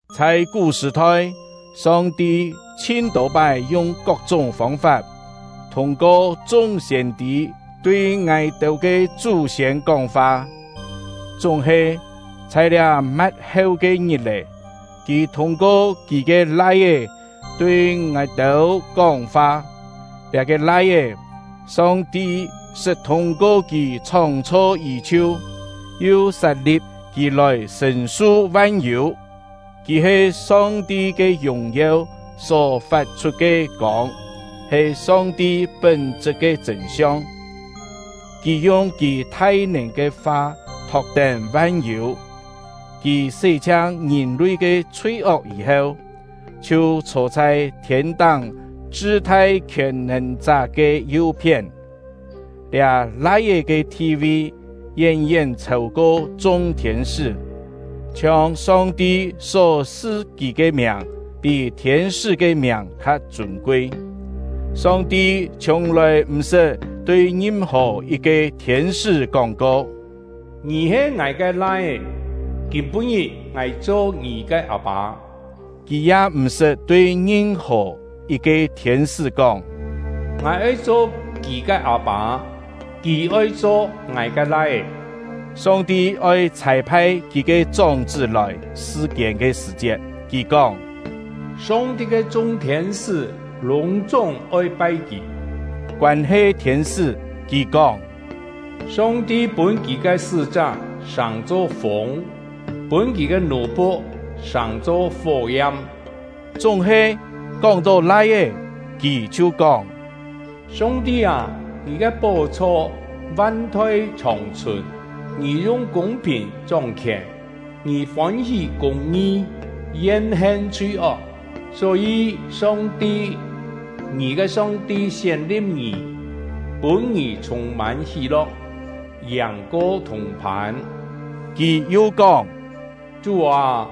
Chhai kú sṳ̀-thoi, Song-ti chhin tô-pái yung kok-chúng fông-fap, thûng-ko chung siên-tî tui ngài-têu ke chú-siên kóng-fa; chúng-he, chhai liá ma̍t-heu ke ngit-è, Kì thûng-ko Kì ke Lai-é tui ngài-têu kóng-fa. Liá-ke Lai-é, Song-ti sṳt thûng-ko kì chhóng-chho yí-chhiu, yu sat-li̍p kì lòi sṳ̀n-su van-yû. Kì he Song-ti ke yùng-yeu só fat-chhut ke kông, he Song-ti pún-chṳt ke chṳ̂n-siong; kì yung kì thai-nèn ke fa thok-tén van-yû. Kì sé-chhiang ngìn-lui ke chhui-ok yî-heu, chhiu chhô chhai thiên-táng chṳ-thai Khièn-nèn-chá ke yu-phién. Liá Lai-é ke thi-vi yén-yén chhêu-ko chung thiên-sṳ́, chhiong Song-ti só-su kì ke miàng pí thiên-sṳ́ ke miàng kha chûn-kui. Song-ti chhiùng-lòi m̀ sṳt tui ngim-hò yit-ke thiên-sṳ́ kóng-ko: Ngì he Ngài ke Lai-é; kîm-pû-ngit Ngài cho ngì ke Â-pâ. Kì ya m̀ sṳt tui ngim-hò yit-ke thiên-sṳ́ kóng: Ngài oi cho kì ke Â-pâ; kì oi cho Ngài ke Lai-é. Song-ti oi chhâi-phai Kì ke chóng-chṳ́ lòi sṳ-kiên ke sṳ̀-chiet, Kì kóng: Song-ti ke chung thiên-sṳ́ lûng-chúng oi pai kì. Koân-he thiên-sṳ́, Kì kóng: Song-ti pûn Kì ke sṳ́-chá sàng-cho fûng, pûn Kì ke nù-phu̍k sàng-cho fó-yam. Chúng-he, kóng-tó Lai-é, Kì chhiu kóng: Song-ti â, Ngì ke pó-chho van-thoi chhòng-chhùn! Ngì yung kûng-phìn chóng-khièn. Ngì fôn-hí kûng-ngi, yen-hen chhui-ok; só-yî Song-ti — ngì ke Song-ti sién-li̍p ngì, pûn ngì chhûng-mân hí-lo̍k, yàng-ko thùng-phân. Kì yu kóng: Chú â,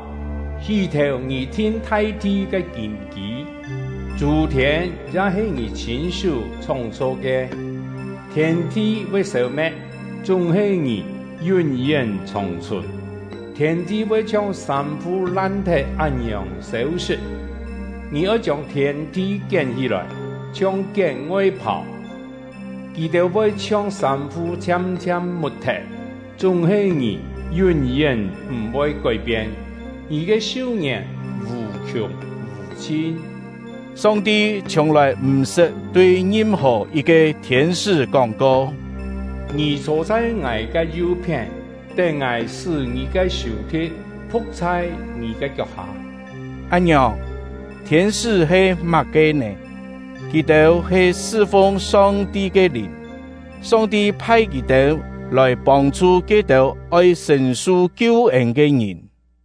hí-thèu ngì thin thai-thi ke kîn-kî; chû-thiên ya he ngì chhîn-sú chhóng-chho ke. Thiên-thi voi sêu-me̍t, chúng-he ngì yún-yén chhòng-chhùn; thiên-thi voi chhiong sâm-fu lan-thet án-ngiòng sêu-sṳt. Ngì oi chiông thiên-thi kién-hí-lòi, chhiong kién ngoi-phàu, kì-têu voi chhiong sâm-fu chhiam-chhiam mut-thet; chúng-he ngì yún-yén m̀-voi kói-pien, ngì ke su-ngièn vù-khiùng vù-chhin. Song-ti chhiùng-lòi m̀-sṳt tui ngim-hò yit-ke thiên-sṳ́ kóng-ko: Ngì chhô chhai Ngài ke yu-phién, tén Ngài sṳ́ ngì ke sù-thi̍t phu̍k chhai ngì ke kiok-hâ. Án-ngiòng, thiên-sṳ́ he má-ke nè? Kì-têu he sṳ-fung Song-ti ke lìn; Song-ti phai kì-têu lòi pông-chhu ke-têu oi sṳ̀n-su kiu-ên ke ngìn.